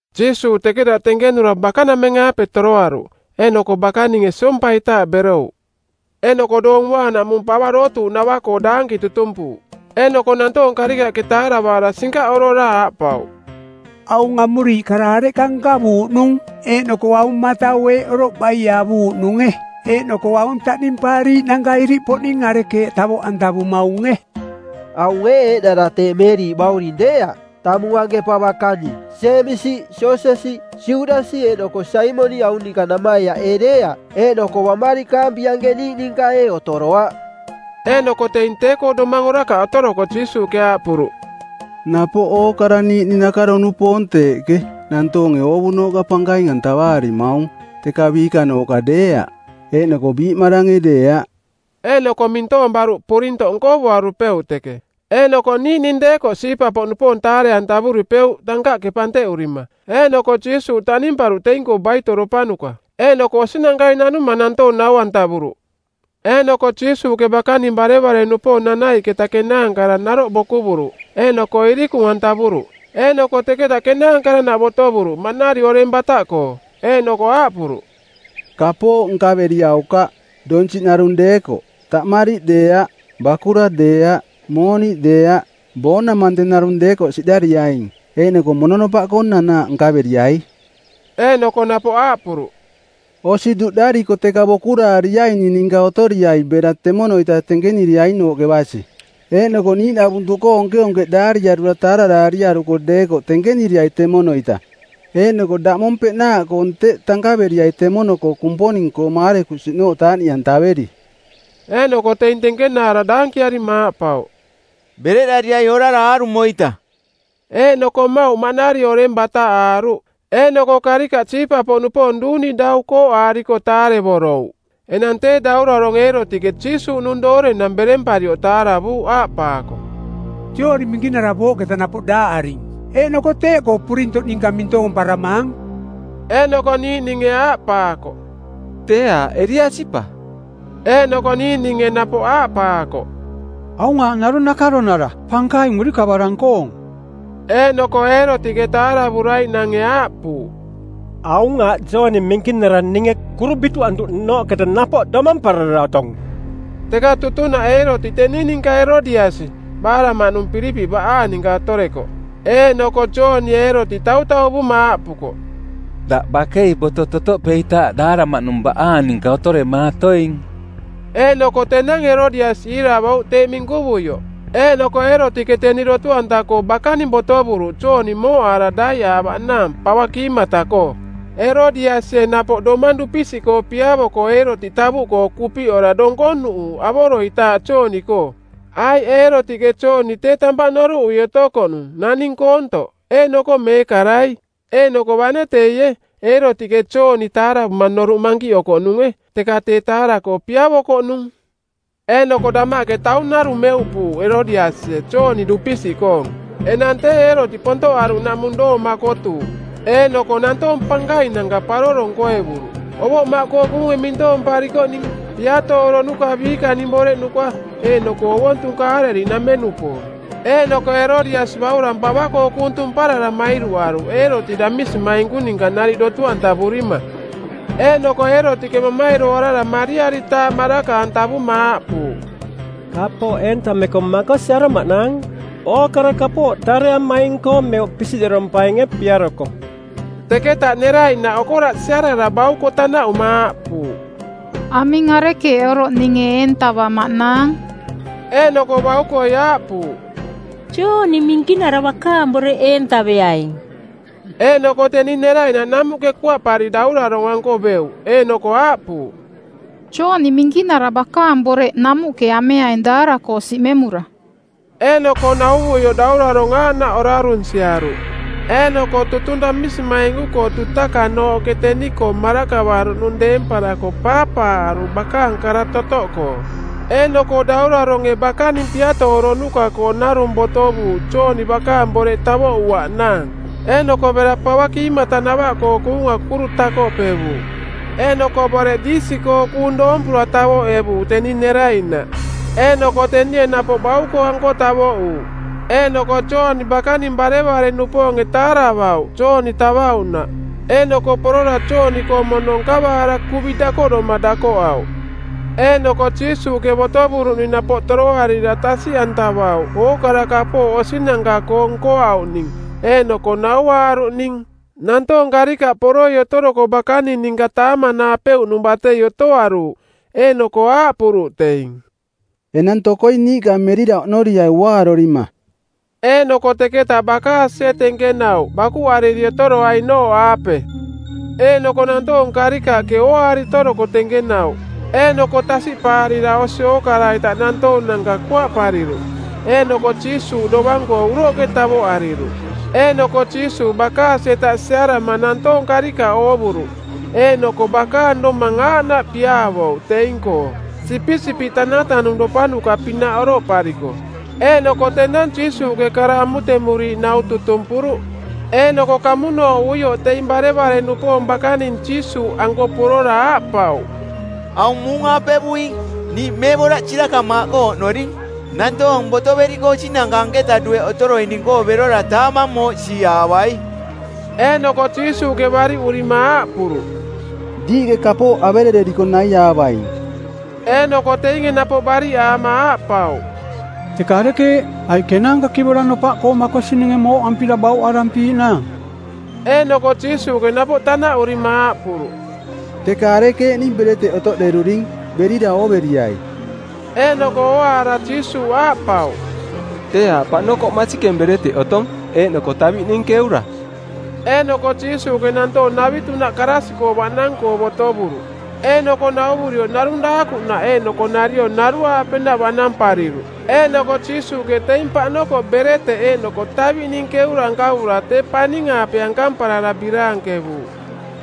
Jiisuuꞌ teketaꞌ tenkenura bakanameng-aape toroaruꞌ, eeꞌnoko bakaninge siompaitaaꞌ berouꞌ. Eeꞌnoko Doong Uaanaꞌmung pava dootuuꞌnava-koo daanki tutumpuuꞌ. Eeꞌnoko nantoong karikaꞌke taaravaara sinkaꞌorora aaꞌpauꞌ, “Aung amuriiꞌ kara areꞌka nkavuuꞌnung? Eeꞌnoko aung matau eeꞌ oroꞌ baie avuuꞌnunge? Eeꞌnoko aung taꞌnimpaariiꞌnanka iriꞌpoꞌning arekeeꞌ tavoꞌantavumaunge? Aung ee eeꞌnara tee Meeriꞌ bauring deeaꞌ, tamung anke pava-kani? Jeemisi, Joosesi, Judasi eeꞌnoko Saimoniꞌ aung ninka namaiaꞌ ee deeaꞌ? Eeꞌnoko baꞌmarikaampi anke niiꞌ ninka ee otoroaꞌ?” Eeꞌnoko teing tee-koo domang orakaꞌ otoroko Jiisuuꞌke aaꞌpuruꞌ, “Napoꞌ ookara niiꞌning nakaro-nupoong-koo teeꞌke, nantoonge oovunooꞌka pankaing-antavaarimaung, teka biikanooꞌka deeaꞌ, eeꞌnoko biiꞌmarange deeaꞌ.” Eeꞌnoko mintoong baruꞌ purintoꞌ nkovuarupeuꞌ teke. Eeꞌnoko niiꞌning deekoꞌ siipa-poꞌnupoong taare-antavuripeuꞌ tankaꞌke panteꞌurima. Eeꞌnoko Jiisuuꞌ taꞌnimparuꞌ teing-koo baitoropanuka. Eeꞌnoko osinankai nanuma nantoong nau-antavuruꞌ. Eeꞌnoko Jiisuuꞌke bakaning barevare-nupoong nanaiꞌketa kenaankara naroꞌ bokuvuruꞌ eeꞌnoko irikung-antavuruꞌ. Eeꞌnoko teketa kenaankaranaꞌ botovuruꞌ maꞌnari oreng bataꞌkoo. Eeꞌnoko aaꞌpuruꞌ, “Kapooꞌ nkaveriaukaꞌ, donsiꞌ narung deekoꞌ. Taꞌmariꞌ deeaꞌ, bakura deeaꞌ, mooniꞌ deeaꞌ. Boonamante˜ narung deekoꞌ siꞌdariaing. Eeꞌnoko mononopaꞌkoo nanaaꞌ nkaveriai.” Eeꞌnoko napoꞌ aaꞌpuruꞌ, “Osi duꞌdariko teka bokuraariaining ninka otoriai bera temono-ita tenkeniriainooꞌke basi. Eeꞌnoko Niiꞌnavuntuꞌkoo onkeonkeꞌdaariarura taararaariaruko deekoꞌ tenkeniriai temono-ita eeꞌnoko daꞌmong peꞌnaaꞌkoong teꞌ tankaveriai temono Kumponing-koo maarekusiꞌnooꞌ taaꞌniꞌantaveri.” Eeꞌnoko teing tenkenaara daankiarima aaꞌpauꞌ, “Bereꞌdarirai orara aarumo-ita.” Eeꞌnoko mmauꞌ maꞌnari oreng bataꞌaaruꞌ. Eeꞌnoko karikaꞌ siipa-poꞌnupoong duuni dau kooꞌaariko taarevorouꞌ. Enang tee Daurarong˜ Eerotiꞌke Jiisuuꞌnung doorenang beremparioꞌ taaravuuꞌ aaꞌpaako, “Jooni Minkinara booꞌketa napoꞌ daaꞌaring, eeꞌnoko teeꞌkoo purintoꞌ ninka mintoomparamaang.” Eeꞌnoko niiꞌninge aaꞌpaakoꞌ, “Tee aaꞌ Eliasi pa.” Eeꞌnoko niiꞌninge napoꞌ aaꞌpaakoꞌ, “Aung aaꞌ narung nakaronara pankaing urikavarang-koong.” Eeꞌnoko Eerotiꞌke taaravuraiꞌnange aaꞌpuuꞌ, “Aung aaꞌ Jooni Minkinara ninge kuru bituꞌantuꞌnooꞌketa napoꞌ domamparara otong.” Teka tutunaꞌ Eerotiꞌ teni ninka Erodiasi, baaraꞌmaꞌnung Pilipiꞌ baꞌaang ninka otorekoꞌ. Eeꞌnoko Joonie Eerotiꞌ tautauvuma aaꞌpukoꞌ, “Daꞌ bakei boto totoꞌpeitaaꞌ daaraꞌmaꞌnung baꞌaang ninka otoremaatoing.” Eeꞌnoko tenang Erodiasi iiravouꞌ teeꞌ minkuvioꞌ. Eeꞌnoko Eerotiꞌke teni dotu-anta-koo bakaning botovuruꞌ Jooni mooꞌaara daiꞌaavaꞌnaang pava kiimata-koo. Erodiasie napoꞌ domang dupisiꞌkoo piavoko Eerotiꞌ tavuꞌkoo kupiꞌora donkonuꞌuuꞌ avoroitaaꞌ Jooni-koo, aiꞌ Eerotiꞌke Jooni tee tampaꞌ noruꞌui otokoꞌnung, naning koontoꞌ eeꞌnoko meekarai. Eeꞌnoko bane teie, Eerotiꞌke Jooni taaravuma noruꞌ mankiꞌokoꞌnunge, teka tee taara-koo piavokoꞌnung. Eeꞌnoko damaꞌke taung narung meuꞌpuuꞌ Erodiasie Jooni dupisiꞌkoong. Enang tee Eerotiꞌ pontoꞌaruꞌnaꞌmung doong makotuuꞌ. Eeꞌnoko nantoong pankainanka paroro nkoevuruꞌ: ovoꞌmaꞌkoo kuunge mintoomparikoꞌning, piatooronuka˜ biikaning boreꞌnuka eeꞌnoko ovontung Kaaleliꞌnameng-nupoong. Eeꞌnoko Erodiasi baurang pava-koo kuung tumparara mairuꞌaruꞌ Eerotiꞌ damisimainku ninka nariꞌ dotu-antavurima. Eeꞌnoko Eerotiꞌke mamairoarara, mariaritaaꞌ maraka-antavuma aaꞌpuuꞌ, “Kapooꞌ eentameko makosi aromaꞌnaang. Ookara kapooꞌ tareamaing-koo meuꞌ pisiꞌderompainge piaroko.” Teketa neraiꞌnaꞌ okoraꞌ siarara bauko tanaꞌuma aaꞌpuuꞌ, “Aming arekeeꞌ oroꞌ ninge eentavamaꞌnaang?” Eeꞌnoko baukoi aaꞌpuuꞌ, “Jooni Minkinara bakaang boreꞌ eentaveaing.” Eeꞌnoko teni neraiꞌnaꞌ namuꞌke kuaꞌpari daurarong-anko beuꞌ eeꞌnoko aaꞌpuuꞌ, “Jooni Minkinara bakaang boreꞌ namuꞌke ameaing daara-koo siꞌmemura.” Eeꞌnoko nauvuioꞌ daurarong aaꞌnaꞌ orarunsiaruꞌ, eeꞌnoko tutung damisimainku-koo dutakanooꞌke teni-koo marakavaruꞌnung deemparako paapaaꞌaruꞌ bakaang kara totoꞌkoo. Eeꞌnoko dauraronge bakaning piatooronuka-koo narung botovuuꞌ Jooni bakaang boreꞌ tavoꞌuaꞌnaang. Eeꞌnoko bera pava kiimatanavaꞌkoo kuunga kuru takoꞌpevuuꞌ. Eeꞌnoko boreꞌ diisi-koo kuung doompura tavoꞌevuuꞌ teni neraiꞌnaꞌ. Eeꞌnoko tenie napoꞌ bauko-anko tavoꞌuuꞌ. Eeꞌnoko Jooni bakaning barevare-nupoonge taaravauꞌ Jooni tavauꞌnaꞌ, eeꞌnoko porora Jooni-koong mono nkavaara kuvi dakoꞌdoma dakoꞌauꞌ. Eeꞌnoko Jiisuuꞌke botovuruꞌning napoꞌ toroarira tasiꞌantavauꞌ ookara kapooꞌ osinanka-koo nkoauꞌning eeꞌnoko nauaaruꞌning. Nantoong karikaꞌ poroi otoroko bakaning ninka taamanaapeuꞌnung batei otoaruuꞌ, eeꞌnoko aaꞌpuruꞌ teing, “Enang tokoi niiꞌka merira oꞌnoriai uaarorima.” Eeꞌnoko teketa bakaasie tenkenauꞌ bakuꞌariri otoroainooꞌaape. Eeꞌnoko nantoong karikaꞌke ooaari otoroko tenkenauꞌ eeꞌnoko tasiꞌpaarira osi ookara-ita nantoonanka kuaꞌpariruꞌ, eeꞌnoko Jiisuuꞌ dovang-koo uroꞌke tavoꞌariruꞌ. Eeꞌnoko Jiisuuꞌ bakaasi-eta siarama nantoong karikaꞌ oovuruꞌ eeꞌnoko bakaang domang aaꞌnaꞌ piaavouꞌ teing-koo, sipisipiꞌ tanatanungropanuka-pinaꞌ oroꞌpariko. Eeꞌnoko tenang Jiisuuꞌke kara amutemuriiꞌ nau tutumpuruꞌ. Eeꞌnoko kamunooꞌuioꞌ teing barevare-nupoong bakaning Jiisuuꞌanko porora aaꞌpauꞌ, “Aung muung-aapevuing. Niiꞌ meeꞌboraꞌ sirakamaaꞌkoo oꞌnoring. Nantoong botoveriko osinanka anketa dueꞌ otoroining-koo berora taamang mooꞌsiaavai.” Eeꞌnoko Jiisuuꞌke bariꞌurima aaꞌpuruꞌ, “Diiꞌke kapooꞌ averereriko naiaavaing.” Eeꞌnoko teinge napoꞌ bariꞌaama aaꞌpauꞌ, “Teka arekeeꞌ? Aiꞌ kenaanka kivora nopaꞌkoo makosininge mooꞌampira bauꞌarampiiꞌnaang?” Eeꞌnoko Jiisuuꞌke napoꞌ tanaꞌurima aaꞌpuruꞌ, “Teka arekeeꞌning bereteꞌ otoꞌderuring? Berira ooveriai.” Eeꞌnoko ooaara Jiisuuꞌ aaꞌpauꞌ, “Tee aaꞌ paꞌnokoꞌ masikeng bereteꞌ otong, eeꞌnoko taviꞌning keura.” Eeꞌnoko Jiisuuꞌke nantoong navitunaꞌ karaasiꞌkoo baꞌnang-koo botovuruꞌ. Eeꞌnoko nauvurioꞌ narung daakuꞌnaꞌ eeꞌnoko nariong naruaapenaꞌ baꞌnampariruꞌ. Eeꞌnoko Jiisuuꞌke teing paꞌnokoꞌ bereteꞌ eeꞌnoko taviꞌning keura nkavura tee paning-aape ankamparara biraankevuuꞌ,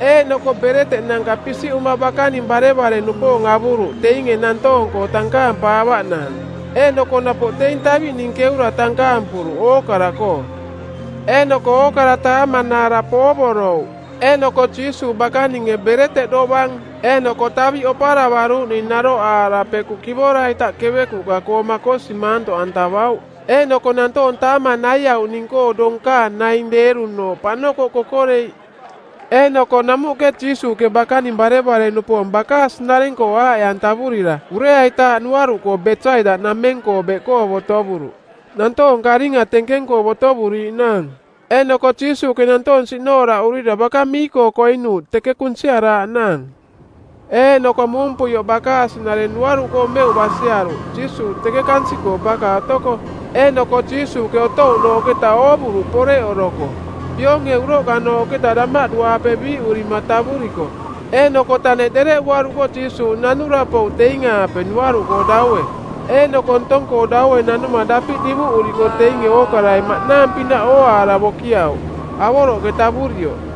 eeꞌnoko bereteꞌnanka pisiꞌuma bakaning barevare-nupoong avuruꞌ teinge nantoong-koo tankaampaavaꞌnaang. Eeꞌnoko napoꞌ teing taviꞌning keura tankaampuruꞌ ookara-koo. Eeꞌnoko ookara taamanaara poovorouꞌ. Eeꞌnoko Jiisuuꞌ bakaninge bereteꞌ dovang eeꞌnoko taviꞌ oparavaruuꞌning naroꞌaara pekuꞌ kivora-ita kevekuꞌka-koo makosi maantoꞌantavauꞌ Eeꞌnoko nantoong taamang naiauꞌning-koo donkaang naing deerunooꞌ paꞌnokoꞌ kokoreiꞌ. Eeꞌnoko namuꞌke Jiisuuꞌke bakaning barevare-nupoong bakaasi-nareng-koo aaꞌe-antavurira ureaitaaꞌ nuaruꞌkoo Besaida-nameng-koo beꞌkoo botovuruꞌ, nantoong karinga tenkeng-koo botovuriiꞌnaang. Eeꞌnoko Jiisuuꞌke nantoong siꞌnooraꞌurira baka mii-koo koinuuꞌ teke kunsiaraaꞌnaang. Eeꞌnoko muumpuioꞌ bakaasi-nareng nuaruꞌkoo meuꞌ basiaruꞌ Jiisuuꞌ teke kansiꞌkoo baka otoko. Eeꞌnoko Jiisuuꞌke otouꞌnooꞌketa oovuruꞌ poreꞌoroko, pionge uroꞌkanooꞌketa damaꞌdu-aape biiꞌurima tavuriko. Eeꞌnoko taneꞌ dereꞌuaruko Jiisuuꞌ nanura pouꞌ teing-aape nuaruꞌkoo daue. Eeꞌnoko ntong-koo daue nanuma dapiꞌ divuꞌuriko teinge ookarai maꞌnaang pinaꞌ ooaara bokiauꞌ, avoroꞌke tavurioꞌ;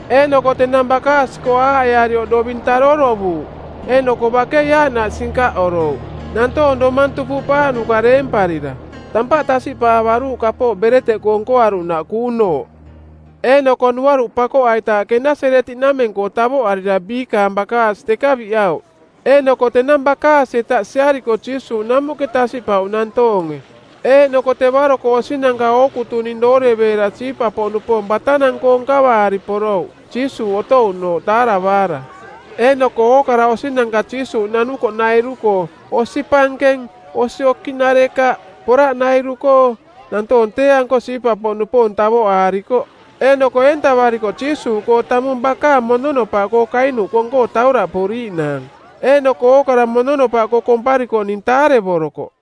Eeꞌnoko tenang bakaasi-koo aaꞌearioꞌ doving taarorovuuꞌ. Eeꞌnoko bakei aaꞌnaꞌ sinkaꞌorouꞌ, nantoong domang tupuꞌpaaꞌnuka deemparira. Tampaꞌ tasiꞌpaavaruuꞌ kapooꞌ bereteꞌkoo nkoaruꞌnaꞌ kuunooꞌ. Eeꞌnoko nuaruꞌ pakoꞌaitaaꞌ Kenaseretiꞌnameng-koo tavoꞌarira biikaang bakaasi teka biꞌauꞌ. Eeꞌnoko tenang bakaasi-eta siariko Jiisuuꞌ namuꞌke tasiꞌpauꞌ nantoonge. Eeꞌnoko tevaro-koo osinanka ookutuning dooreveera siipa-poꞌnupoong batanang-koo nkavaari porouꞌ Jiisuuꞌ otouꞌnooꞌ taaravaara. Eeꞌnoko ookara osinanka Jiisuuꞌ nanukoꞌnairu-koo-osi pankeng, osi okiꞌnarekaꞌ, poraꞌnairu-koo-nantoong tee-anko siipa-poꞌnupoong tavoꞌaarikoꞌ. Eeꞌnoko eentavariko Jiisuuꞌkoo tamung bakaang mononopaꞌkoo kainuꞌ kong-koo tauraꞌpuriiꞌnaang. Eeꞌnoko ookara mononopaꞌkoo komparikoꞌning taarevorokoꞌ.